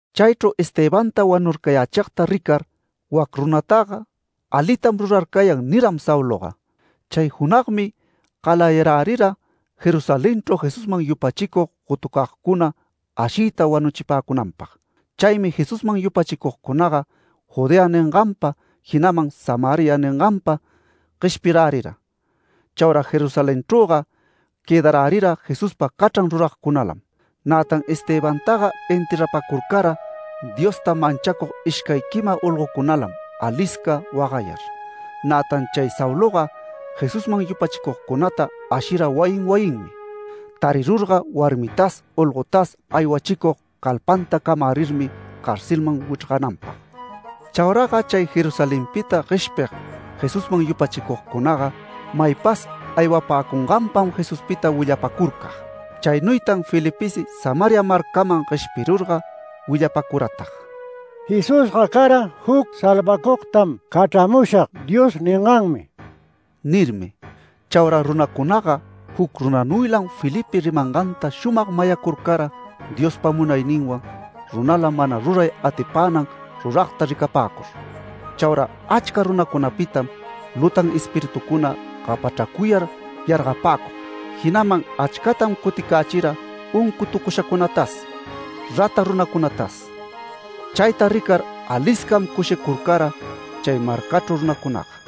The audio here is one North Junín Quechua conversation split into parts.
Chaychru Estebanta wanurcayächigta ricar “Wac runataga alitam rurarcayan” niram Sauloga. Chay junagmi galayarärira Jerusalenchru Jesusman yupachicug gotucagcuna ashiyta wanuchipäcunanpag. Chaymi Jesusman yupachicugcunaga Judea ninganpa, jinaman Samaria ninganpa gueshpirärira. Chaura Jerusalenchrüga quëdarärira Jesuspa cachran ruragcunalam. Nätan Estebantaga enterrapacurcara Diosta manchacug ishcay quima olgocunalam alisca wagayar. Nätan chay Sauloga Jesusman yupachicugcunata ashira wayin wayinmi. Tarirurga warmitas olgotas aywachicug calpanta camärirmi carcelman wichrgananpag. Chauraga chay Jerusalenpita gueshpig, Jesusman yupachicugcunaga, maypas aywapäcunganpam Jesuspita willapacurcag. Chaynuytan Felipesi Samaria marcaman gueshpirurga willapacuratag: “Jesusga cara juc ‘Salvacugtam cachramushag’ Dios ninganmi” nirmi. Chaura runacunaga juc runanuylam Felipe rimanganta shumag mayacurcara Diospa munayninwan runala mana ruray atipänan ruragta ricapäcur. Chaura achca runacunapitam lutan espiritucuna gapachracuyar yargapäcug, jinaman achcatam cuticächira uncutucushacunatas, rata runacunatas. Chayta ricar aliscam cushicurcara chay marcachru runacunaga.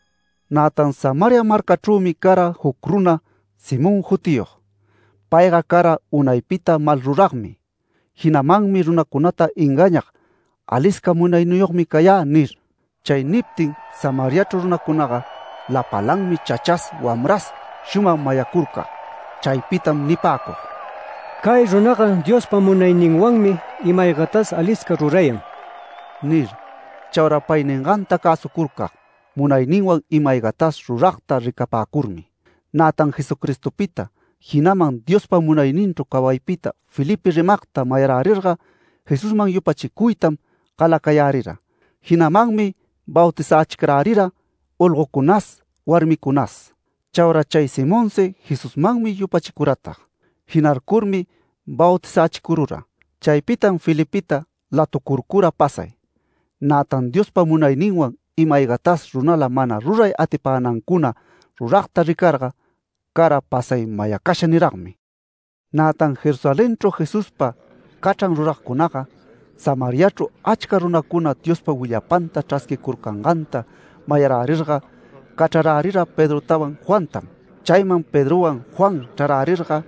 Nätan Samaria marcachrümi cara juc runa Simón jutiyog. Payga cara unaypita malruragmi. Jinamanmi runacunata engañag “Alisca munayniyogmi cayä” nir. Chay niptin Samariachru runacunaga lapalanmi chachas wamras shumag mayacurcag. Chaypitam nipäcug: “Cay runaga Diospa munayninwanmi ima-aygatas alisca rurayan” nir. Chaura pay ninganta cäsucurcag, munayninwan ima-aygatas ruragta ricapäcurmi. Nätan Jesucristopita, jinaman Diospa munayninchru cawaypita Felipe rimagta mayarärirga Jesusman yupachicuytam galacayärira. Jinamanmi bautizächicarärira olgocunas, warmicunas. Chaura chay Simonsi Jesusmanmi yupachicuratag. Jinarcurmi bautizächicurura. Chaypitam Felipeta latucurcura pasay. Nätan Diospa munayninwan ima-aygatas runala mana ruray atipänancuna ruragta ricarga cara pasay mayacasha niragmi. Nätan Jerusalenchru Jesuspa cachran ruragcunaga Samariachru achca runacuna Diospa willapanta chrasquicurcanganta mayarärirga cachrarärira Pedrotawan Juantam. Chayman Pedrowan Juan chrarärirga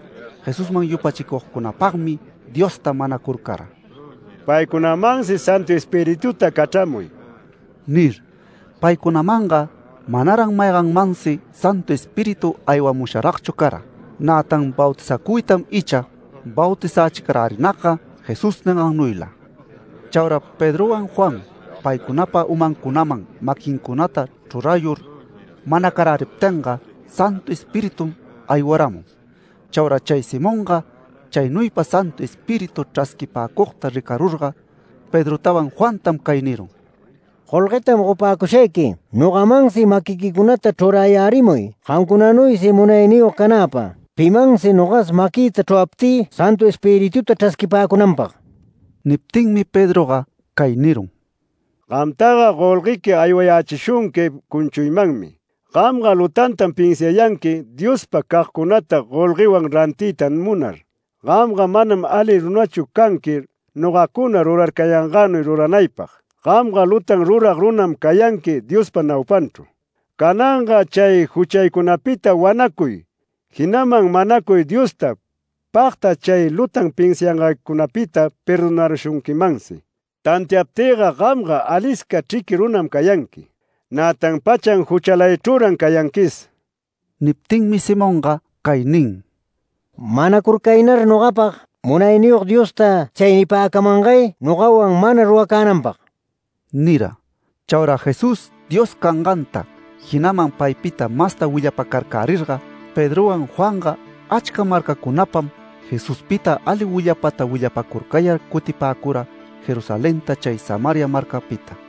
Jesusman yupachicugcunapagmi Diosta manacurcara: “Paycunamansi Santu Espirituta cachramuy” nir. Paycunamanga manaran mayganmansi Santu Espíritu aywamusharagchu cara. Nätan bautizacuytam icha bautizächicarärinagga Jesús ningannuyla. Chaura Pedrowan Juan paycunapa umancunaman maquincunata chrurayur manacaräriptinga, Santu Espiritum aywaramun. Chaura chay Simonga, chaynuypa Santu Espíritu chrasquipäcugta ricarurga Pedrotawan Juantam cay nirun: “Golguetam gopäcushayqui nogamansi maquiquicunata chrurayärimuy gamcunanuysi munayniyog canäpag, pimansi nogas maquïta chruraptï Santu Espirituta chrasquipäcunanpag”. Niptinmi Pedroga cay nirun: “Gamtaga golguequi aywayächishunqui cunchuymanmi. Gamga lutantam pinsiayanqui Diospa cagcunata golguewan rantiyta munar. Gamga manam ali runachu canqui nogacuna rurarcayangänuy ruranaypag. Gamga lutan rurag runam cayanqui Diospa naupanchru. Cananga chay juchaycunapita wanacuy, jinaman manacuy Diosta pagta chay lutan pinsiangaycunapita perdonarushunquimansi. Tantiaptïga gamga alisca chriqui runam cayanqui, nätan pachan juchalaychrüran cayanquis”. Niptinmi Simonga cay nin: “Manacurcaynar nogapag, Munayniyog Diosta chay nipäcamangay nogawan mana ruracänanpag” nira. Chaura Jesús Dios canganta, jinaman paypita masta willapacarcärirga Pedrowan Juanga achca marcacunapam Jesuspita ali willapata willapacurcayar cutipäcura Jerusalenta chay Samaria marcapita.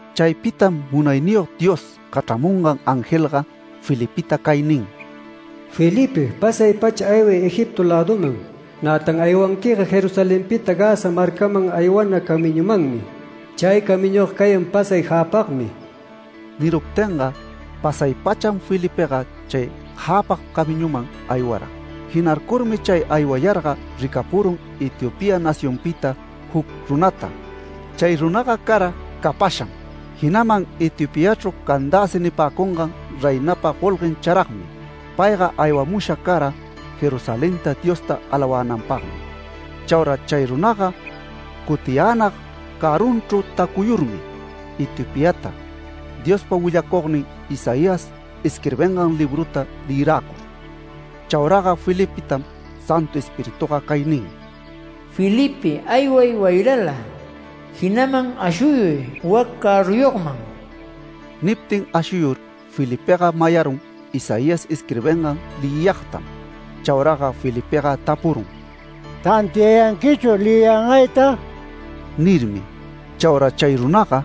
Chaypitam Munayniyog Dios cachramungan angelga Felipeta cay nin: “Felipe, pasay-pacha ayway Egipto läduman, nätan aywanquiga Jerusalenpita Gaza marcaman aywana camiñumanmi. Chay camiñuga cayan pasay jäpagmi”. Niruptinga pasay-pacham Felipega chay jäpag camiñuman aywara. Jinarcurmi chay aywayarga ricapurun Etiopía nacionpita juc runata. Chay runaga cara capasham, jinaman Etiopiachru Candace nipäcungan reinapa golguen charagmi. Payga aywamusha cara Jerusalenta Diosta alawänanpagmi. Chaura chay runaga cutiyänag cärrunchru tacuyurmi Etiopiata, Diospa willacugnin Isaías isquirbingan libruta leyiräcur. Chauraga Felipetam Santu Espirituga cay nin: “Felipe, ayway wayrala, jinaman ashuyuy wac cärruyogman”. Niptin ashuyur Felipega mayarun Isaías isquirbingan leyiyagtam. Chauraga Felipega tapurun: “¿Tantiayanquichu leyiyangayta?” nirmi. Chaura chay runaga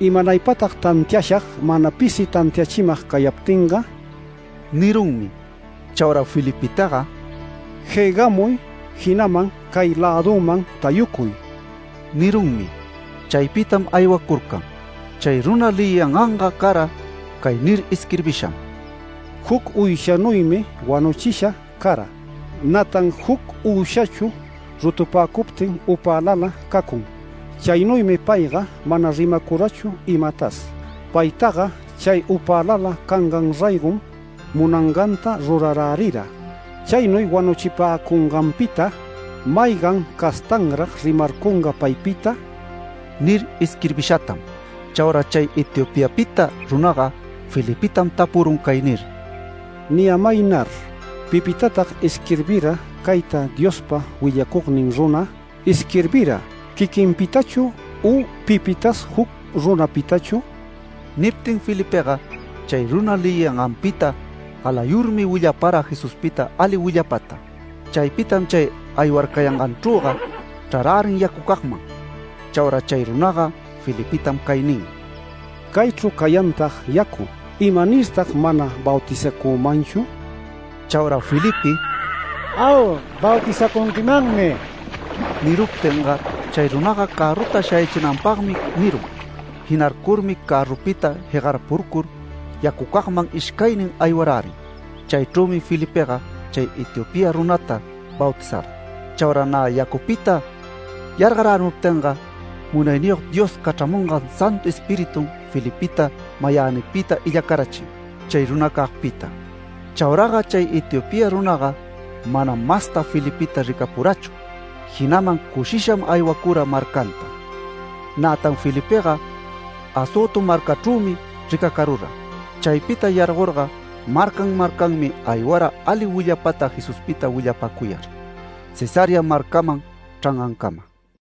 “¿Imanaypatag tantiashag mana pisi tantiachimag cayaptinga?” nirunmi. Chaura Felipetaga “Jegamuy, jinaman cay lädüman tayucuy” nirunmi. Chaypitam aywacurcan. Chay runa leyiyanganga cara cay nir isquirbisham: “Juc uyshanuymi wanuchisha cara. Nätan juc uyshachu rutupäcuptin upälala cacun, chaynuymi payga mana rimacurachu imatas. Paytaga chay upälala cangan raygom munanganta rurarärira. Chaynuy wanuchipäcunganpita ¿maygan castanrag rimarcunga paypita?” nir isquirbishatam. Chaura chay Etiopiapita runaga Felipetam tapurun cay nir: “Niyämaynar, ¿pipitatag isquirbira cayta Diospa willacugnin runa? ¿Isquirbira quiquinpitachu u pipitas juc runapitachu?” Niptin Felipega chay runa leyiyanganpita galayurmi willapara Jesuspita ali willapata. Chaypitam chay aywarcayanganchrüga chrarärin yacucagman. Chaura chay runaga Felipetam cay nin: “Caychru cayantag yacu. ¿Imanirtag mana bautizacümanchu?” Chaura Felipe “Au, bautizacunquimanmi” niruptinga, chay runaga cärruta shayachinanpagmi nirun. Jinarcurmi cärrupita jegarpurcur yacucagman ishcaynin aywarärin. Chaychrümi Felipega chay Etiopía runata bautizara. Chaura nä yacupita yargarärimuptinga, Munayniyog Dios cachramungan Santu Espiritum Felipeta mayänipita illacarachin chay runacagpita. Chauraga chay Etiopía runaga manam masta Felipeta ricapurachu. Jinaman cushisham aywacura marcanta. Nätan Felipega Azoto marcachrümi ricacarura. Chaypita yargorga marcan marcanmi aywara ali willapata Jesuspita willapacuyar Cesarea marcaman chrangancama.